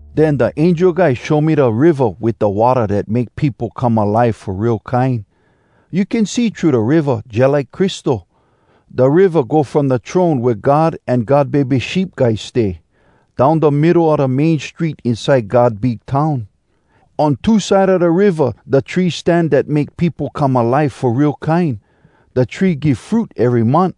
Den da angel guy show me da riva wit da watta dat make peopo come alive fo real kine. You can see thru da riva, jalike crystal. Da riva go from da throne wea God an God Bebe Sheep Guy stay, down da middo a da main street inside God big town. On two side a da riva da trees stan dat make peopo come alive fo real kine. Da tree give fruit ery month,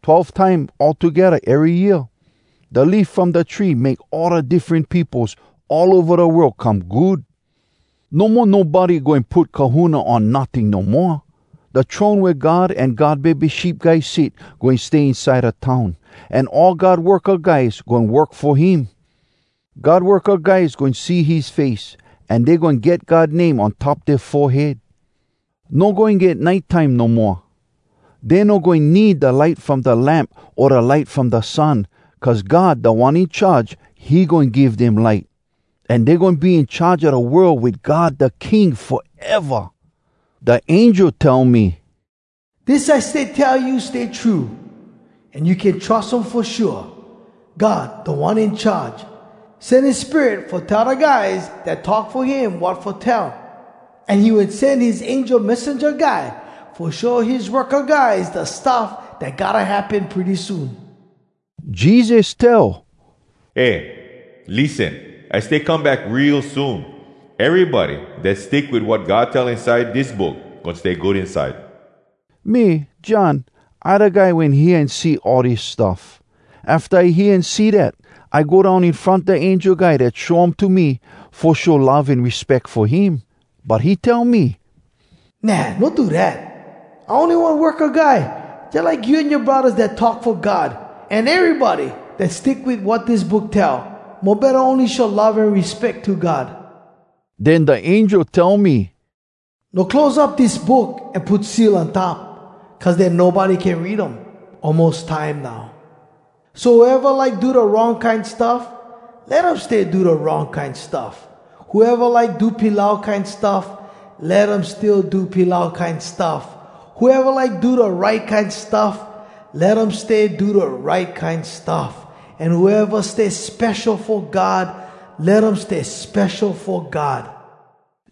twelve time all togedda ery year. Da leaf from da tree make all da diffren peopos all ova da world come good. No mo nobody goin put kahuna on notting no moa. Da throne wea God an God Bebe Sheep Guy sit goin stay inside da town, an all God worka guys goin work fo him. God worka guys goin see his face, an dey goin get God name on top dea forehead. No goin get nite time no moa. Dey no goin need da light from da lamp o da light from da sun, cuz God, Da One In Charge, he goin give dem light. An dey goin be in charge a da world wit God da King foeva. Da angel tell me, “Dis I stay tell you stay true, an you can trus um fo shua. God, Da One In Charge, sen his Spirit fo tell da guys dat talk fo him wat fo tell. An he wen sen his angel messenja guy fo show his worka guys da stuff dat gotta happen pretty soon.” Jesus tell, “Eh, lissen! I stay come back real soon! Erybody dat stick wit wat God tell inside dis book goin stay good inside.” Me, John, I da guy wen hear an see all dis stuff. Afta I hear an see dat, I go down in front da angel guy dat show um to me, fo show love an respeck fo him. But he tell me, “Nah! No do dat! I ony one worka guy jalike you an yoa braddahs dat talk fo God, an erybody dat stick wit wat dis book tell. Mo betta, ony show love an respeck to God!” Den da angel tell me, “No close up dis book an put seal on top, cuz den nobody can read um. Almos time now. So whoeva like do da wrong kine stuff, let um stay do da wrong kine stuff. Whoeva like do pilau kine stuff, let um still do pilau kine stuff. Whoeva like do da right kine stuff, let um stay do da right kine stuff. An whoeva stay spesho fo God, let um stay spesho fo God.”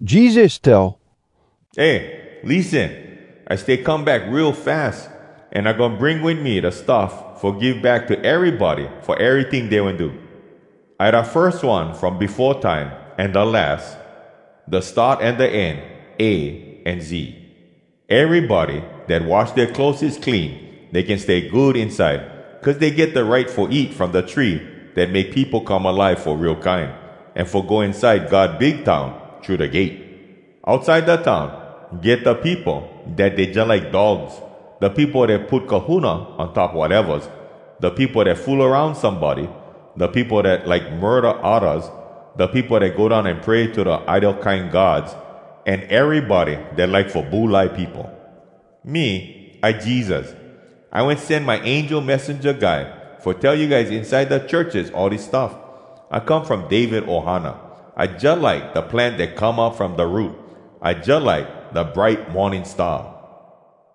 Jesus tell, “Eh, lissen! I stay come back real fas! An I goin bring wit me da stuff fo give back to erybody fo eryting dey wen do. I da firs one from befo time, an da las, da start an da end, A an Z. “Erybody dat wash dea clotheses clean, dey can stay good inside, cuz dey get da right fo eat from da tree dat make peopo come alive fo real kine. An fo go inside God big town thru da gate. Outside da town get da peopo dat dey jalike dogs, da peopo dat put kahuna on top watevas, da peopo dat fool aroun somebody, da peopo dat like murda oddas, da peopo dat go down an pray to da idol kine gods, an erybody dat like fo bulai peopo. “Me, I Jesus. I wen sen my angel messenja guy fo tell you guys inside da churches all dis stuff. I come from David ohana. I jalike da plant dat come up from da root. I jalike da bright Morning Star.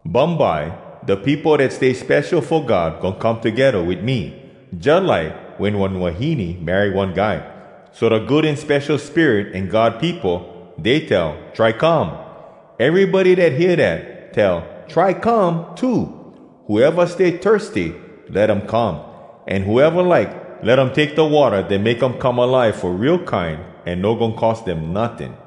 Bumbye da peopo dat stay spesho fo God goin come togedda wit me, jalike wen one wahine marry one guy. So da Good An Spesho Spirit an God peopo, dey tell, ‘Try come!’ Erybody dat hear dat, tell ‘Try come!’ too. Whoeva stay thirsty let um come, an whoeva like, let um take da watta dat make um come alive fo real kine, an no goin cost dem notting.”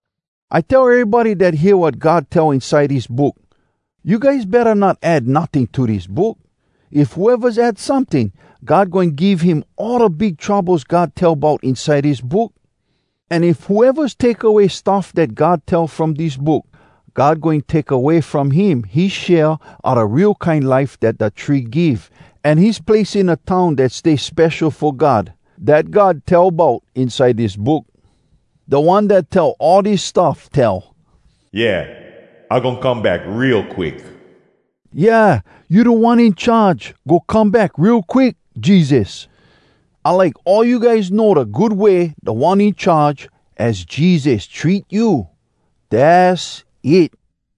I tell erybody dat hear wat God tell inside dis book: You guys betta not add notting to dis book. If whoevas add someting, God goin give him all da big troubles God tell bout inside dis book. An if whoevas take away stuff dat God tell from dis book, God goin take away from him his share a da real kine life dat da tree give, an his place in da town dat stay spesho fo God, dat God tell bout inside dis book. Da One dat tell all dis stuff tell, “Yeah, I goin come back real quick!” Yeah, You Da One In Charge! Go come back real quick, Jesus! I like all you guys know da good way Da One In Charge, az Jesus, treat you! Dass it!